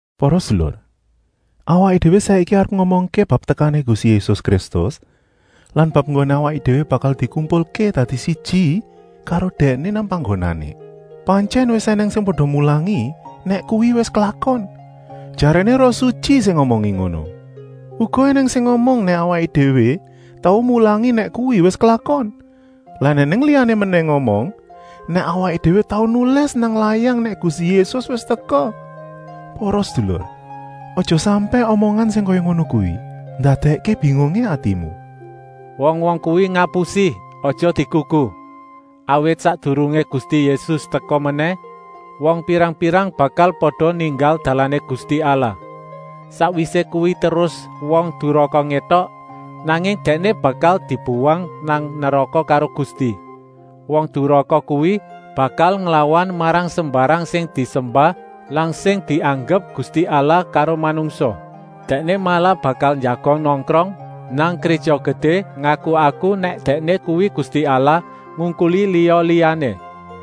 Para sedulur, awaké déwé saiki arep ngomongké bab tekané Gusti Yésus Kristus lan bab enggoné awaké déwé bakal dikumpulké dadi siji karo Dèkné nang panggonané. Pantyèn wis ènèng sing pada mulangi nèk kuwi wis klakon. Jaréné Roh Sutyi sing ngomongi ngono. Uga ènèng sing ngomong nèk awaké déwé tau mulangi nèk kuwi wis klakon lan ènèng liyané menèh ngomong nèk awaké déwé tau nulis nang layang nèk Gusti Yésus wis teka. Para sedulur, aja sampèk omongan sing kaya ngono kuwi ndadèkké bingungé atimu. Wong-wong kuwi ngapusi, aja digugu. Awit sakdurungé Gusti Yésus teka menèh wong pirang-pirang bakal pada ninggal dalané Gusti Allah. Sakwisé kuwi terus Wong Duraka ngétok, nanging dèkné bakal dibuwang nang neraka karo Gusti. Wong Duraka kuwi bakal nglawan marang sembarang sing disembah lan sing dianggep gusti allah karo manungsa. Dèkné malah bakal njagong nongkrong nang Gréja Gedé, ngaku-aku nèk dèkné kuwi Gusti Allah, ngungkuli liya-liyané.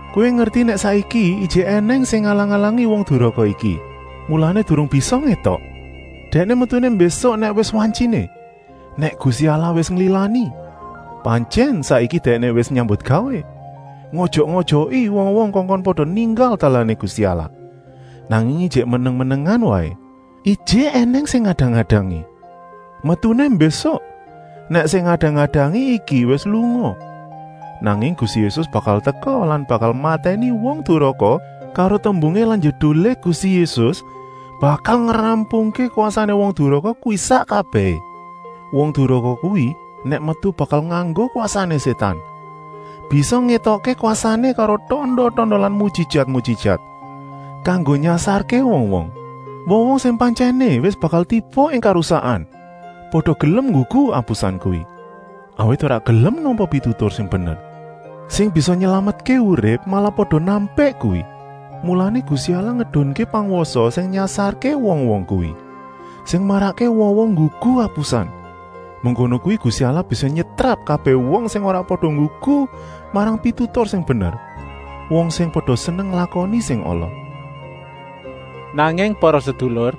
Kowé ngerti nèk saiki ijik ènèng sing ngalang-alangi Wong Duraka iki, mulané durung bisa ngétok. Dèkné metuné mbésuk nèk wis wantyiné, nèk Gusti Allah wis nglilani. Pantyèn saiki dèkné wis nyambutgawé, ngojok-ojoki wong-wong kongkon pada ninggal dalané Gusti Allah, nanging ijik meneng-menengan waé. Ijik ènèng sing ngadang-adangi. Metuné mbésuk, nèk sing ngadang-adangi iki wis lunga. Nanging Gusti Yésus bakal teka lan bakal matèni Wong Duraka karo tembungé lan njedulé Gusti Yésus bakal ngrampungké kwasané Wong Duraka kuwi sak kabèhé. Wong Duraka kuwi nèk metu bakal nganggo kwasané Sétan, bisa ngétokké kwasané karo tanda-tanda lan mujijat-mujijat, kanggo nyasarké wong-wong. Wong-wong sing pantyèné wis bakal tiba ing karusakan pada gelem nggugu apusan kuwi. Awit ora gelem nampa pitutur sing bener, sing bisa nylametké uripé, malah pada nampik kuwi. Mulané Gusti Allah ngedunké pangwasa sing nyasarké wong-wong kuwi, sing marakké wong-wong nggugu apusan. Mengkono kuwi Gusti Allah bisa nyetrap kabèh wong sing ora pada nggugu marang pitutur sing bener, wong sing pada seneng nglakoni sing ala. Nanging para sedulur,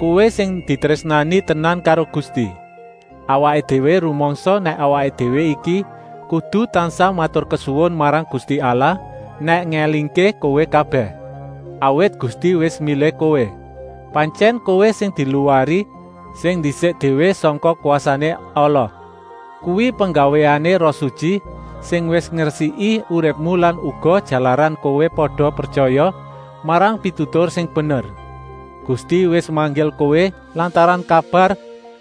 kowé sing ditrésnani tenan karo Gusti. Awaké déwé rumangsa nèk awaké déwé iki kudu tansah maturkesuwun marang Gusti Allah nèk ngélingké kowé kabèh. Awit Gusti wis milih kowé. Pantyèn kowé sing diluwari sing ndisik déwé sangka kwasané ala. Kuwi penggawéané Roh Sutyi, sing wis ngresiki uripmu lan uga jalaran kowé pada pretyaya marang pitutur sing bener. Gusti wis manggil kowé lantaran kabar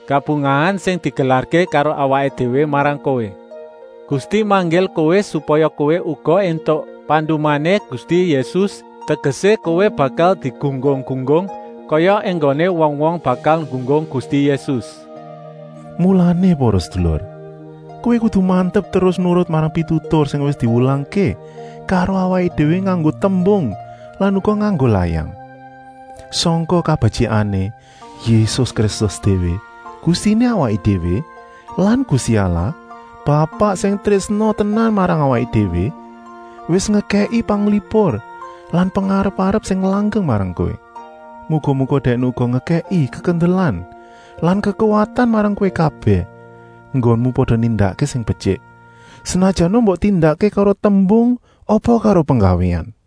kabungahan sing digelarké karo awaké déwé marang kowé. Gusti manggil kowé supaya kowé uga éntuk pandumané Gusti Yésus, tegesé, kowé bakal digunggung-gunggung kaya enggoné wong-wong bakal nggunggung Gusti Yésus. Mulané para sedulur, kowé kudu mantep terus nurut marang pitutur sing wis diwulangké karo awaké déwé nganggo tembung lan uga nganggo layang. Sangka kabetyikané, Yésus Kristus déwé, Gustiné awaké déwé lan Gusti Allah, Bapak sing trésna tenan marang awaké déwé, wis ngekèki panglipur lan pengarep-arep sing langgeng marang kowé. Muga-muga Dèkné uga ngekèki kekendelan lan kekuwatan marang kowé kabèh enggonmu pada nindakké sing betyik, senajana mbok tindakké karo tembung apa karo penggawéan.